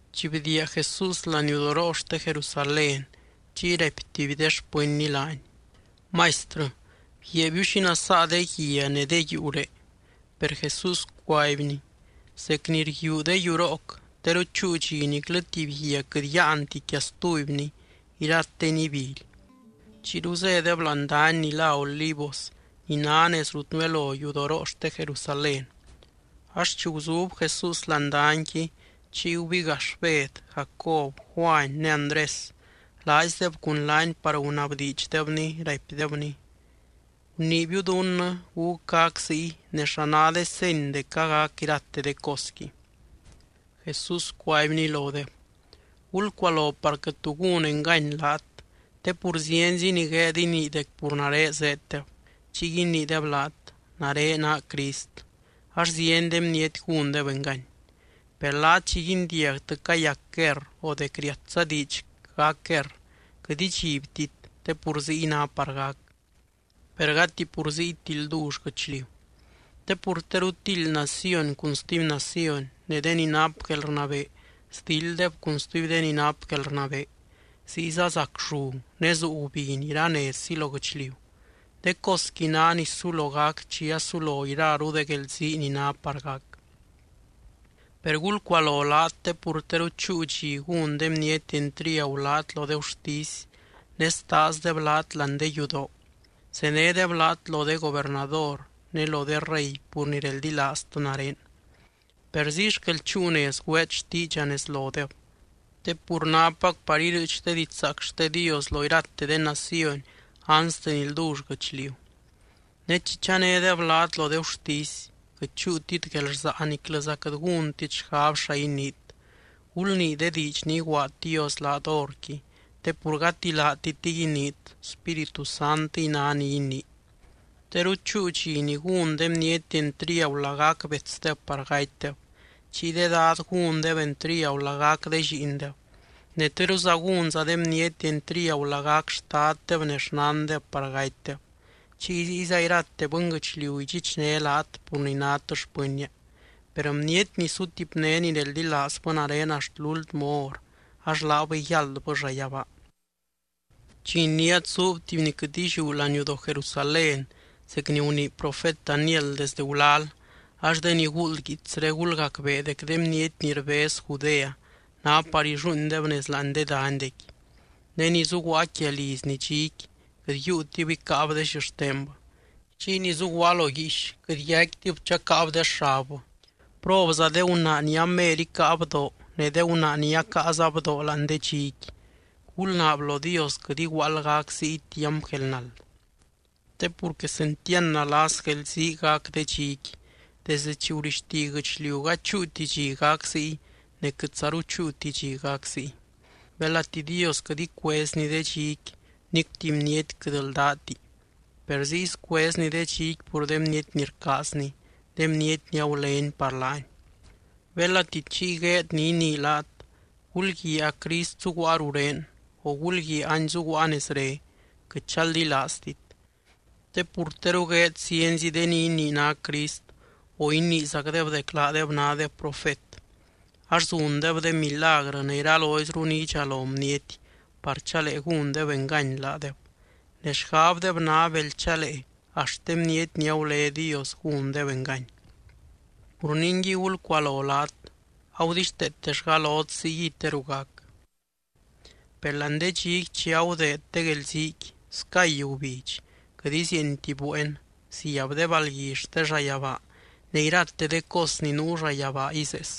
Chi bdiia Jesús laniudoroo xte Jerusalén, chiy raipy tuby de xpɨnny laany: —¡Maistrɨ, bguiaabiu xi nasaa de guia ne de yuuré! Per Jesús cuaibny: —Zec ni rguíu de yurooc, teru chúu dxi niclɨ tuby guia quɨt yáanti quia stubyni, irateni ibily. Chiyru zédeb láani dany ni lá Olivos ni ná nez rut nuelo yudoroo xte Jerusalén. Ax chi guzub Jesús láani danyqui chiy gubigax Bed, Jacob, Juany ne Andrés, laaizdeb cun laany par gunabdiidxdebny, raipdebny: —Guniibiu dunnɨ, ¿gúc gac ziy ne xa ná de seny dec agac irate de cosqui? Jesús cuaibny lodeb: —Gulcualo par quɨt tu gúnti engany laat. Te pur zienzi ni gueed inii dec pur nare zéeddeb. Chiy iniideb laat: “Nare naa Crist”, ax zieny de bniety gúndeb engany. ’Per laat chi guindiagtɨ cayac guerr o dec riatza diidx gac guerr, quɨt idxibtit te pur ziy ná par gac. Per gati pur ziyti ldull guɨchliu. Te pur teru tildy naciony cun stuby naciony ne de ni nap guelrnabee sdilddeb cun stuby de ni nap guelrnabee. Ziyza zac llu ne zuu gubiny iranezzi lo guɨchliu. De cosqui ná ni sulo gac chi asulo iraru de guelzii ni ná par gac. ’Per gulcualo laat te pur teru chúu dxi gún de bniety entriagu laat lo de gurtisy ne staazdeb laat láani de yudoo. Zenédeb laat lo de gobernador ne lo de rey pur ni reldilaaztɨ nare, per ziy xquel chúu nez güeet xtiidxa nez lodeb. Te pur nápac par irɨɨch de didxzaac xte Dios lo irate de naciony anste ni ldull guɨchliu. Ne chi chanédeb laat lo de gurtisy, quɨt chúutit guelrsaa niclɨza quɨt gúntit xgab xa iniit. Gulnii de diidx ni iguaad Dios laat horqui, te pur gati laatitɨy iniit, Spíritu Santɨy ná ni inii. Teru chúu dxi ni gún de bniety entriagu lagac betsdeb par gatydeb. Chiy de dad gúndeb entriagu lagac de lliindeb. Ne teruza gúnza de bniety entriagu lagac xtaddeb ne xnandeb par gatydeb. Chiy ziyza irate bɨnguɨchliu idxichné laat pur ni nát xpɨnnia, per bniety ni sutipné ni reldilaazbɨ nare axt lúltmɨ hor, ax laabɨy yáldbɨ llayabaa. ’Chi iniát zuub tuby ni quɨt illiú laniudoo Jerusalén zec ni gunii profet Daniel desdɨ gulal (ax de ni guuld guiitsré, gulgacbee) dec de bniety ni rbez Judea ná par illuuindeb nez láani de danydequi. Ne ni zuguaa quia lizni dxiqui, quɨt yiiutib icáab de xixtenbɨ. Chiy ni zuguaa lo guiix quɨt yaicquitib chacáab de xabbɨ. ¡Probza de gunaa ni amer icáa bdoo ne de gunaa ni acaaza bdoo láani de dxiqui! Gulnaab lo Dios quɨt iguaald gac ziy tiamp guelnald. Te pur quesentiand nalas guelzii gac de dxiqui, desde chi gurixti guɨchliu gady chúuti chi gac ziy ne quɨtzaru chúuti chi gac ziy. Belati Dios quɨt icuezny de dxiqui, nic tuby bniety quɨt ldáti. Per ziy scuezny de dxiqui pur de bniety ni rcaazny, de bniety ni agulény par laany. ’Belati chiy gueed ni inii laat: “Gulguiaa a Crist zuguaa rurén”, o “Gulguiaa any zuguaa nezre”, quɨt chaldilaaztit. Te pur teru gueed zienzi de ni inii ná Crist o iniizacdeb dec laadeb nádeb profet. Ax zundeb de milagrɨ ne iraloizru ni idxalo bniety par chalee gúndeb engany laadeb, ne xgabdeb ná bel chalee axt de bniety ni agulé Dios gúndeb engany. Pur ningui, gulcualo laat, agudixteetellga lot ziyguiy teru gac. ’Per láani de dxiqui chi agudeed de guelziiqui, scay gubidx, quɨt izieenti bueen, ziab de balgui xte llayabaa ne irate de cos ni nuu llayabaa izees.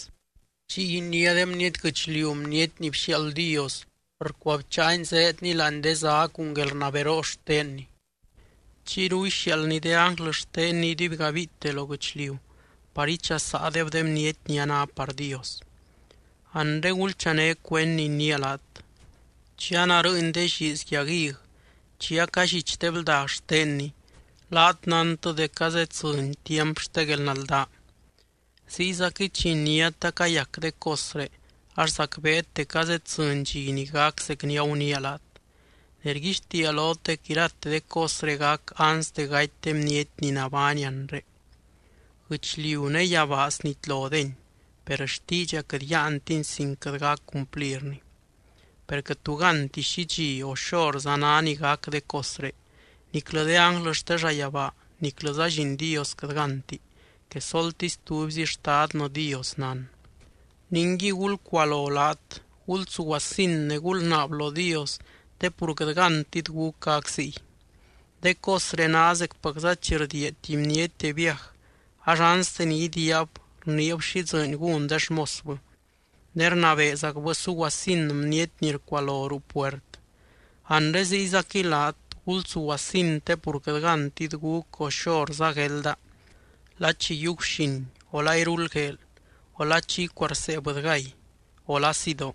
Chiy iniá de bniety guɨchliu Bniety ni bxiaald Dios, rcuabcháany zéedny láani de zá cun guelrnaberoo xtenny. Chiyru ixiaaldny de ánglɨ xtenny iduibgabiite lo guɨchliu par ichasaadeb de bniety ni a ná par Dios. ’Anre gulchané cuend ni iniia laat. Chi anarɨɨny de lliiz yag hig, chi acallich de bldag xtenni, laat nántɨ dec azeddzɨny tiamp xte guelnaldaa. Ziyzaquɨy chi iniát acayac de cosré, ax zacbeet dec azeddzɨny dxi ni gac zec ni aguniia laat. Ne rguixtiia lot dec irate de cosré gac anste gaty de bniety ni nabány anre. Guɨchliu ne yabaa snitlodeni, per xtiidxa quɨt yáantini sin quɨt gac cumplirni. ’Per quɨt tu gánti xi dxi o xorza ná ni gac de cosré, niclɨ de ánglɨ xte llayabaa niclɨza Lliin Dios quɨt gánti. Quesoltisy tubyzi Xtadnɨ Dios nán. ’Ningui, gulcualo laat, gulsuguasin ne gulnaab lo Dios te pur quɨt gántit gúc gac ziy. De cosré ná zecpacza chi rdiia tuby bniety de viaj. Ax anste ni idiiab rniib xi dzɨɨny gún de xmosbɨ, ne rnabeezacbɨ suguasin bniety ni rcualo ruu puert. Anre ziyzaquɨy laat, gulsuguasin, te pur quɨt gántit gúc o xorza guelda, la chi yiiu guxin o la iruldgueel o la chi icuarsee bɨdygay o la sidoo.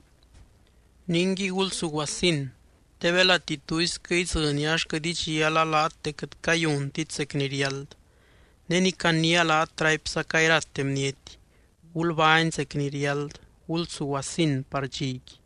Ningui, gulsuguasin te belati tuisquɨ idzɨnia ax quɨt idxiala laat dec quɨt cayuntit zec ni riáld. Ne ni caniia laat, raipzaca irate bniety: Gulbány zec ni riáld, gulsuguasin par dxiqui.